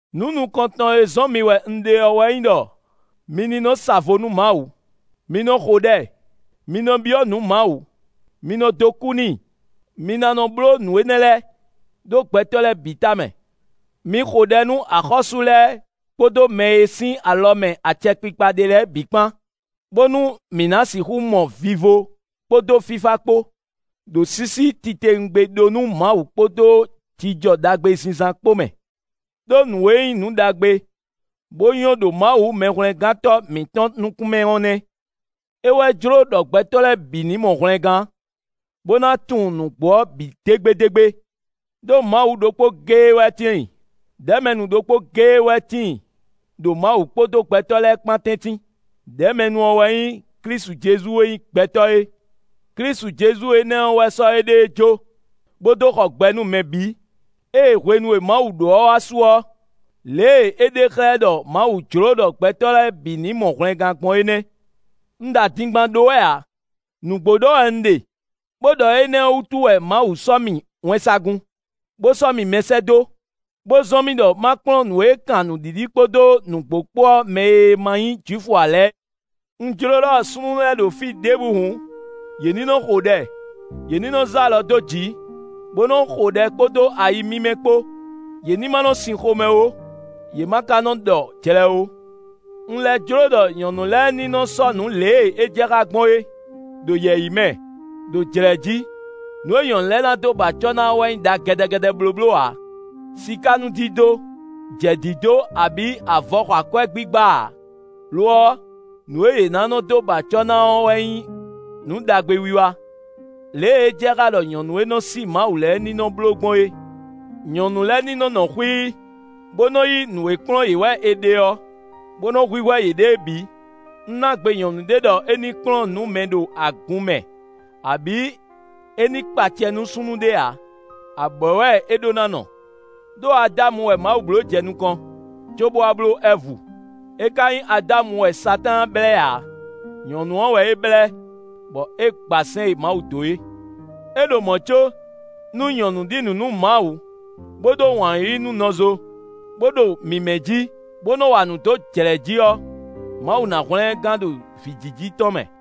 Nǔ nukɔntɔn e zɔ́n mi wɛ un ɖe ɔ́ wɛ nyí ɖɔ mi ní nɔ sa vo nú Mawu; mi nɔ xo ɖɛ; mi nɔ byɔ́ nǔ Mawu; mi nɔ dó kú n'i; mi ná nɔ bló nǔ énɛ́ lɛ́ɛ, ɖó gbɛtɔ́ lɛ́ɛ bǐ tamɛ. Mi xo ɖɛ nú axɔ́sú lɛ́ɛ kpódó mɛ e sín alɔ mɛ acɛkpikpa ɖe lɛ́ɛ bǐ kpán, bónú mǐ ná sixú mɔ vivo kpódó fífá kpó, ɖo sísí titewungbe ɖó nú Mawu kpódó jijɔ ɖagbe zínzán kpó mɛ. Đó nǔ e nyí nǔ ɖagbe, bó nyɔ́ ɖo Mawu Mɛhwlɛ́ngántɔ́ mǐtɔn nukún mɛ ɔ́ nɛ́. É wɛ jló ɖɔ gbɛtɔ́ lɛ́ɛ bǐ ní mɔ hwlɛngán, bó ná tunwun nǔgbó ɔ́ bǐ dégbédégbé. Đó Mawu ɖokpó géé wɛ tíin; ɖɛ̌mɛnu ɖokpó géé wɛ tíin ɖo Mawu kpódó gbɛtɔ́ lɛ́ɛ kpán tɛ́ntin. Đɛ̌mɛnu ɔ́ wɛ nyí Klísu Jezu e nyí gbɛtɔ́ é. Klísu Jezu énɛ́ ɔ́ wɛ sɔ́ éɖée jó, bó dó xɔ gbɛ nú mɛ bǐ. Ée hwenu e Mawu ɖó ɔ́ wá su ɔ́, lě e é ɖe xlɛ́ ɖɔ Mawu jló ɖɔ gbɛtɔ́ lɛ́ɛ bǐ ní mɔ hwlɛngán gbɔn é nɛ́. Un ɖo adingban ɖó wɛ ǎ; nǔgbó ɖɔ wɛ un ɖe bó ɖɔ énɛ́ ɔ́ wútu wɛ Mawu sɔ́ mì wɛnsagun, bó sɔ́ mì mɛsɛ́dó, bó zɔ́n mì ɖɔ ma kplɔ́n nǔ e kan nǔɖiɖi kpódó nǔgbó kpó ɔ́ mɛ e ma nyí Jwifu ǎ lɛ́ɛ. Un jló ɖɔ súnnu lɛ́ɛ ɖo fí ɖěbǔ hǔn, yě ní nɔ xo ɖɛ, yě ní nɔ zé alɔ dó jǐ, bó nɔ xo ɖɛ kpódó ayi mímɛ́ kpó; yě ní ma nɔ sin xomɛ ó, yě ma ka nɔ ɖɔ jlɛ ó. Un lɛ́ jló ɖɔ nyɔ̌nu lɛ́ɛ ní nɔ́ sɔ́nǔ lě e é jɛ xá gbɔn é, ɖo yɛ̌yi mɛ, ɖo jlɛ̌ jí. Nǔ e nyɔ̌nu lɛ́ɛ ná dó ba acɔ́ ná ɔ́ wɛ nyí ɖa gɛ́dɛ́gɛ́dɛ́ blóbló ǎ; sikánúdídó, jɛ̌dídó abǐ avɔ xɔ akwɛ́ gbígbá ǎ; lo ɔ́, nǔ e yě ná nɔ dó ba acɔ́ ná ɔ́ wɛ nyí nǔ ɖagbe wiwa, lě e é jɛ xá ɖɔ nyɔ̌nu e nɔ sí Mawu lɛ́ɛ ní nɔ bló gbɔn é. Nyɔ̌nu lɛ́ɛ ní nɔ nɔ xwíí, bó nɔ́ yí nǔ e kplɔ́n yě wɛ è ɖe ɔ́, bó nɔ́ hwíhwɛ́ yěɖée bǐ. Un ná gbe nyɔ̌nu ɖé ɖɔ é ní kplɔ́n nǔ mɛ ɖo agun mɛ abǐ é ní kpa acɛ nú súnnu ɖé ǎ. Abwɛ̌ wɛ é ɖó ná nɔ. Đó Adámu wɛ Mawu bló jɛ nukɔn, cóbó wá bló Ɛvu. É ka nyí Adámu wɛ Satáan blɛ́ ǎ; nyɔ̌nu ɔ́ wɛ é blɛ́, bɔ é gba sɛ́n e Mawu dó é. É ɖo mɔ̌ có, nú nyɔ̌nu ɖi nǔ nú Mawu, bó ɖó wǎn yíyí nú nɔzo, bó ɖo mímɛ́ jí, bó nɔ wa nǔ dó jlɛ̌ jí ɔ́, Mawu ná hwlɛ́n ɛ gán ɖo vǐjiji tɔn mɛ.